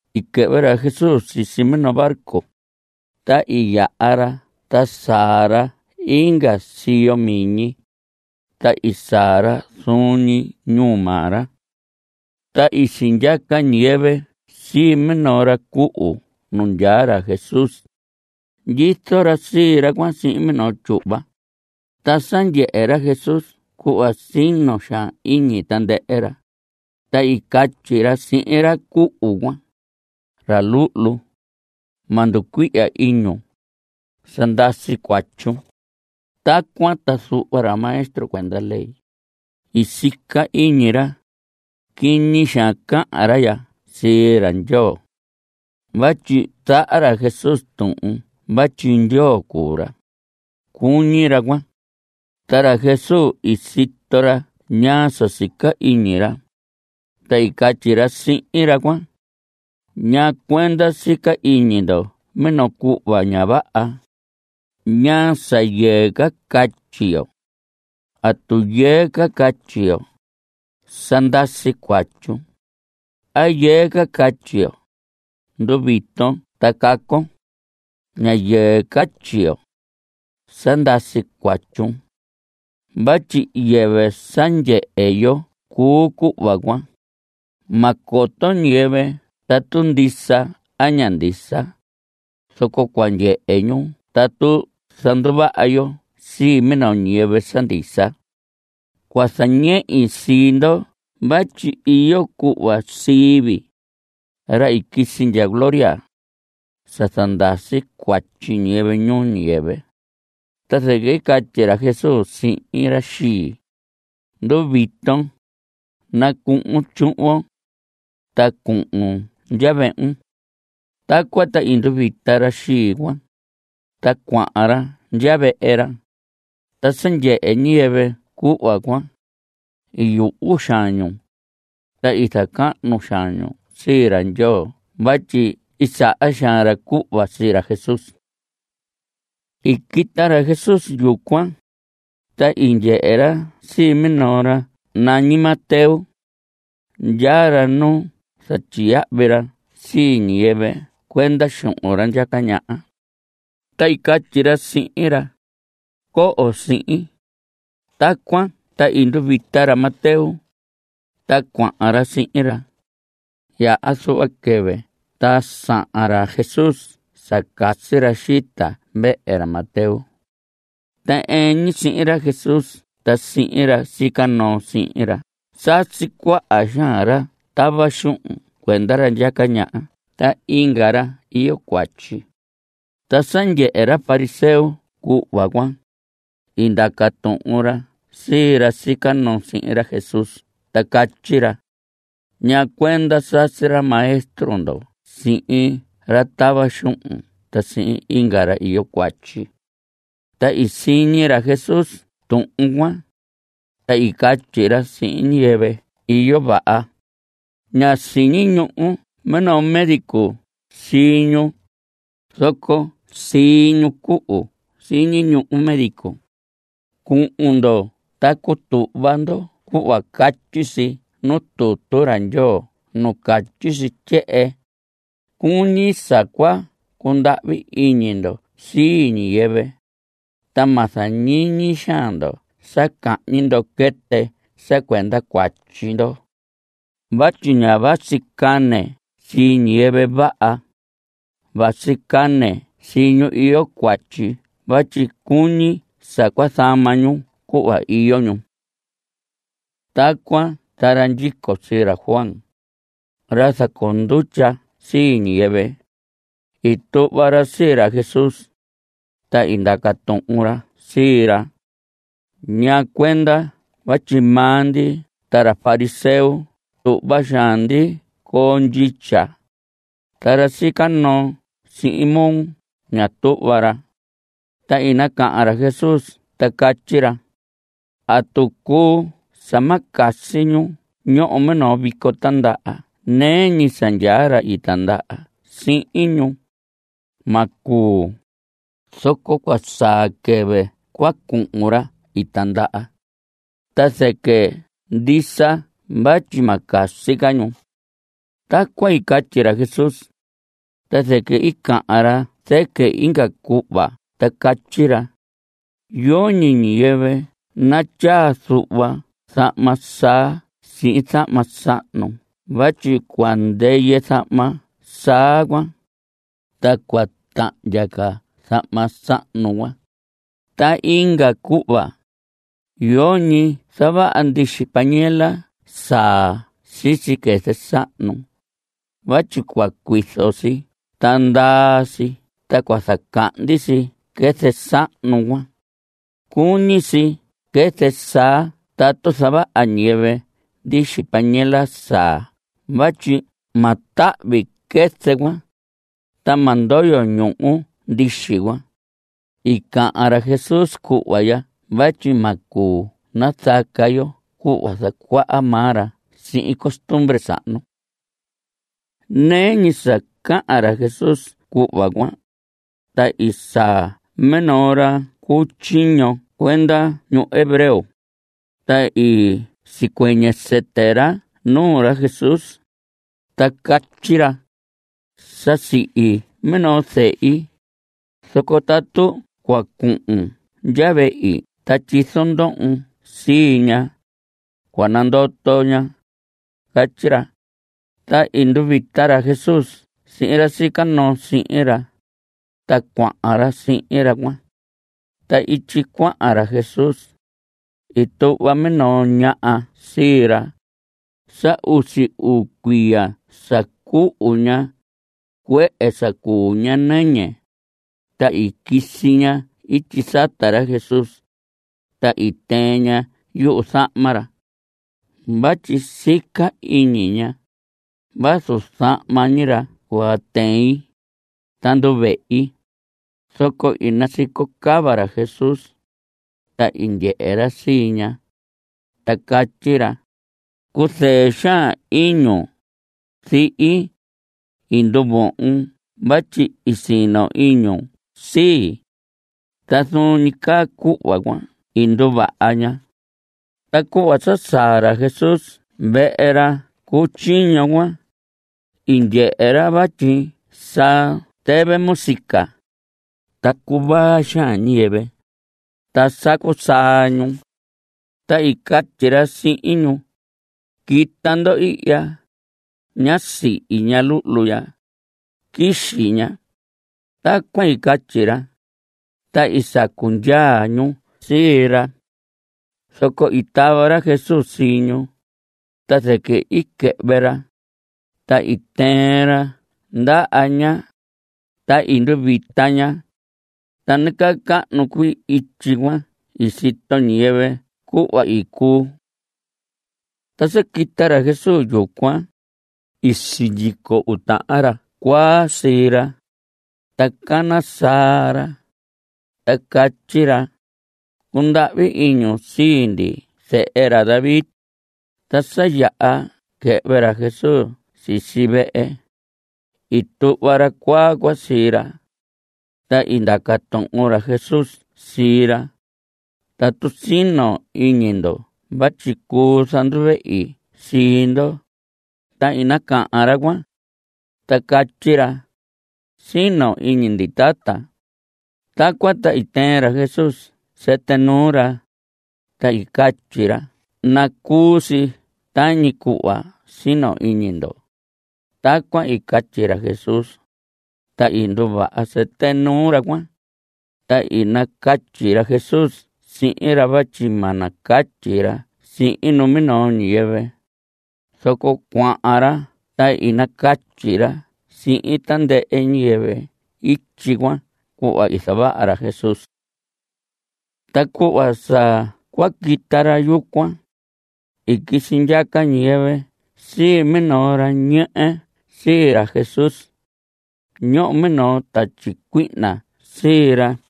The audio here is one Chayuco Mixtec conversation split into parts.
I quɨhvɨ ra Jesús sisi minoo barco, ta i yaha ra ta saa ra inga siyo miñi, ta i saa ra zuun ñi ñuu maa ra. Ta i sindyaca ñiyɨvɨ sii minoo ra cuhu nu ndyaa ra Jesús. Ndyizo ra sii ra cuan sihin minoo tyuhva. Ta sa ndyehe ra Jesús cuhva sino xaan iñi tandɨhɨ ra, ta i catyi ra sihin ra cuhu cuan: Ra luhlu, ma nducuihya iñun. Sa ndasi cuatyun. Tacuan ta zuhva ra maestro cuenda ley, i sica iñi ra: “Quiñi xaan cahan ra ya sii ra Ndyoo.” (Vatyi zaha ra Jesús tuhun vatyi Ndyoo cuu ra, cuñi ra cuan.) Ta ra Jesús i sito ra ñaa sa sica iñi ra, ta i catyi ra sihin ra cuan: ¿Ñaa cuenda sica iñi ndo minoo cuhva ña vaha? ¿Ñaa sa yɨɨ ca catyi yo? ¿Atu yɨɨ ca catyi yo: “Sa ndasi cuatyun”, a yɨɨ ca catyi yo: “Nduviton ta cacon”? (Ña yɨɨ catyi yo: “Sa ndasi cuatyun.” Vatyi yɨvɨ sa ndyehe yo cuu cuhva cuan. Ma coto ñiyɨvɨ tatu ndisa a ña ndisa. Zoco cua ndyehe ñu tatu zanduvaha yo sii minoo ñiyɨvɨ sa ndisa.) Cua zañehi sii ndo vatyi iyo cuhva sii vii, ra i quisi ndya gloria, sa zandasi cuatyi ñiyɨvɨ ñuu ñiyɨvɨ. Ta zɨquɨ i catyi ra Jesús sihin ra xii: Nduviton. Nacuhun tyuhvon, ta cuhun ndya vehun. Tacuan ta i nduvita ra xii cuan, ta cuahan ra ndya vehe ra. Ta sa ndyehe ñiyɨvɨ cuhva cuan, i yuhu xaan ñu, ta i zacahnu xaan ñu sii ra Ndyoo vatyi i saha xaan ra cuhva sii ra Jesús. I quita ra Jesús yucuan, ta i ndyehe ra sii minoo ra nañi Mateo. Ndyaa ra nu zatyiyahvi ra sii ñiyɨvɨ cuenda xuhun ra ndyaca ñaha. Ta i catyi ra sihin ra: Coho sihin. Tacuan ta i nduvita ra Mateo, ta cuahan ra sihin ra. Yaha zuhva quɨvɨ ta sahan ra Jesús sa casi ra xita vehe ra Mateo. Ta ɨɨn ñi sihin ra Jesús ta sihin ra sica noo sihin ra sasi cuaha xaan ra tava xuhun cuenda ra ndyaca ñaha ta inga ra iyo cuatyi. Ta sa ndyehe ra fariseo cuhva cuan, i ndaca tuhun ra sii ra sica noo sihin ra Jesús ta catyi ra: ¿Ñaa cuenda sasi ra maestro ndo sihin ra tava xuhun ta sihin inga ra iyo cuatyi? Ta i siñi ra Jesús tuhun cuan, ta i catyi ra: Ñiyɨvɨ iyo vaha, ña siñi ñuhu minoo médico sii ñu, zoco sii ñu cuhu siñi ñuhu médico. Cuhun ndo ta cutuhva ndo cuhva catyi si nuu tutu ra Ndyoo nu catyi si tyehen: “Cuñi sa cua cundahvi iñi ndo sii ñiyɨvɨ, ta ma zañiñi xaan ndo sa cahñi ndo quɨtɨ sa cuenda cuatyi ndo.” Vatyi ña vasi cane sii ñiyɨvɨ vaha, vasi cane sii ñu iyo cuatyi vatyi cuñi sa cua zama ñu cuhva iyo ñu. Tacuan ta ra ndyico sii ra Juan, ra zacoo ndutya sii ñiyɨvɨ, i tuhva ra sii ra Jesús, ta i ndaca tuhun ra sii ra: ¿Ñaa cuenda vatyi maa ndi ta ra fariseo tuhva xaan ndi coo ndyitya, ta ra sica noo sihin moo, ña tuhva ra? Ta i nacahan ra Jesús ta catyi ra: ¿Atu cuu sa ma casi ñu ñoho minoo vico tindaha nɨɨ ñi sa ndyaa ra i tindaha sihin ñu? Ma cuu. Zoco cua saa quɨvɨ cua cuhun ra i tindaha, ta zɨquɨ ndisa vatyi ma casi ñu. Tacuan i catyi ra Jesús, ta zɨquɨ i cahan ra zɨquɨ inga cuhva ta catyi ra: Yoñi ñiyɨvɨ natyaa zuhva zahma saa sii zahma sahnu vatyi cua ndɨyɨ zahma saa cuan, ta cua tahndya ca zahma sahnu cuan. Ta inga cuhva, yoñi zavaha ndixi panela saa sisi quɨzɨ sahnu vatyi cua cuizo si ta ndaa si ta cua cahndi quɨzɨ sahnu cuan. Cuñi si quɨzɨ saa tatu zavaha ñiyɨvɨ ndixi panela saa vatyi ma tahvi quɨzɨ cuan, ta ma ndoyo ñuhu ndixi cuan. (I cahan ra Jesús cuhva ya vatyi ma cuu nazaca yo cuhva zacuaha maa ra sihin costumbre sahnu.) Nɨɨ ñi sa cahan ra Jesús cuhva cuan, ta i saa minoo ra cu tyiño cuenda ñu hebreo, ta i sicuɨñɨ sɨtɨ ra nuu ra Jesús, ta catyi ra: Sa sihi minoo zehi, zoco tatu cua cuhun ndya vehi ta tyizon ndohon sii ña, cua nandoto ña. Catyi ra. Ta i nduvita ra Jesús sihin ra sica noo sihin ra, ta cuahan ra sihin ra cuan. Ta ityi cuahan ra Jesús, i tuhva minoo ñaha sii ra. Sa usi uu cuiya sa cuhun ña, cuehe sa cuu ña nɨñɨ. Ta i quisi ña ityi sata ra Jesús, ta i tɨɨn ña yuzahma ra. Vatyi sica iñi ña: “Vazu zahma ñi ra cua tɨin, ta nduvehi.” Zoco i nasico cava ra Jesús, ta i ndyehe ra sii ña, ta catyi ra: Cuzɨɨ xaan iñun, zihi. I nduvohon vatyi i sino iñun sii. Ta zuun ñi caa cuhva cuan i nduvaha ña. Ta cuhva sa saa ra Jesús vehe ra cu tyiño cuan, i ndyehe ra vatyi sa tɨvɨ música, ta cuvaa xaan ñiyɨvɨ, ta sacu saa ñu. Ta i catyi ra sihin ñu: Quita ndo ihya. Ñá sihi ña luhlu ya. Quixi ña. Tacuan i catyi ra, ta i sacu ndyaa ñu sii ra. Zoco i tava ra Jesús sii ñu, ta zɨquɨ i quɨhvɨ ra, ta i tɨɨn ra ndaha ña, ta i nduvita ña. Ta nacahnu cuii ityi cuan i sito ñiyɨvɨ cuhva i cuu. Ta sa quita ra Jesús yucuan, i sindyico uu tahan ra cuaa sii ra, ta cana saa ra, ta catyi ra: ¡Cundahvi iñun sii ndi Zehe ra David! Ta sa yaha quɨhvɨ ra Jesús sisi vehe, i tuhva ra cuaa cuan sii ra. Ta i ndaca tuhun ra Jesús sii ra: ¿Atu sino iñi ndo vatyi cuu zanduvehi sii ndo? Ta i nacahan ra cuan, ta catyi ra: Sino iñi ndi, tata. Tacuan ta i tɨɨn ra Jesús sɨtɨ nuu ra, ta i catyi ra: Nacuu si tañi cuhva sino iñi ndo. Tacuan i catyi ra Jesús, ta i nduvaha sɨtɨ nuu ra cuan. Ta i nacatyi ra Jesús sihin ra vatyi ma nacatyi ra sihin numinoo ñiyɨvɨ. Zoco cuahan ra ta i nacatyi ra sihin tandɨhɨ ñiyɨvɨ ityi cuan cuhva i zavaha ra Jesús. Ta cuhva sa cua quita ra yucuan, i quisi ndyaca ñiyɨvɨ sii minoo ra ñehe sii ra Jesús. Ñoho minoo tatyi cuihna sii ra cuan.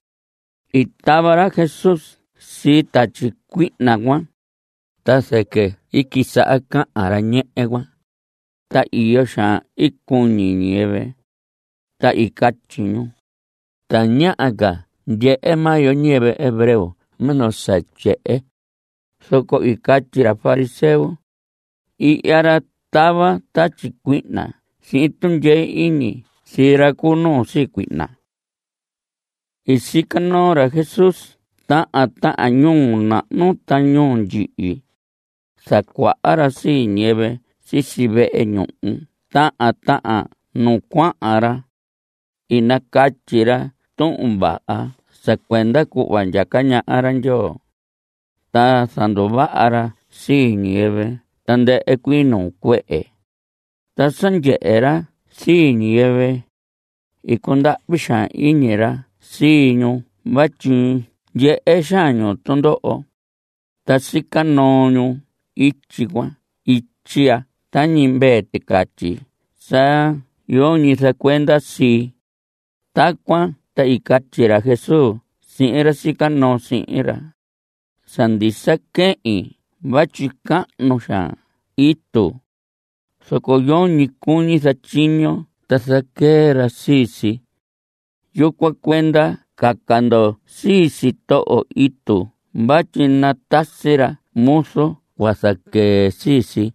I tava ra Jesús sii tatyi cuihna cuan, ta zɨquɨ i quisaha cahan ra ñehe cuan. Ta iyo xaan i cuñi ñiyɨvɨ, ta i catyi ñu: Tañaha ca ndyehe maa yo ñiyɨvɨ hebreo minoo sa tyehen. Zoco i catyi ra fariseo: Ihya ra tava tatyi cuihna sihin tundyee iñi sii ra cu nuu sii cuihna. I sica noo ra Jesús tahan tahan ñuu nahnu ta ñuu ndyihi. Zacuaha ra sii ñiyɨvɨ sisi vehe ñuhu tahan tahan nu cuahan ra. I nacatyi ra Tuhun Vaha sa cuenda cuhva ndyaca ñaha ra Ndyoo. Ta zanduvaha ra sii ñiyɨvɨ tandɨhɨ cuii nuu cuehe. Ta sa ndyehe ra sii ñiyɨvɨ, i cundahvi xaan iñi ra sii ñu vatyi ndyehe xaan ñu tundoho, ta sica noo ñu ityi cuan ityi ya tañi mvee ticatyi sa yoñi zacuenda sii. Tacuan ta i catyi ra Jesús sihin ra sica noo sihin ra: Sa ndisa quehin vatyi cahnu xaan itu, zoco yoñi cuñi zatyiño ta zaquee ra sii si. Yucuan cuenda caca ndo sii sitoho itu vatyi natasi ra muzu cua zaquee sii si.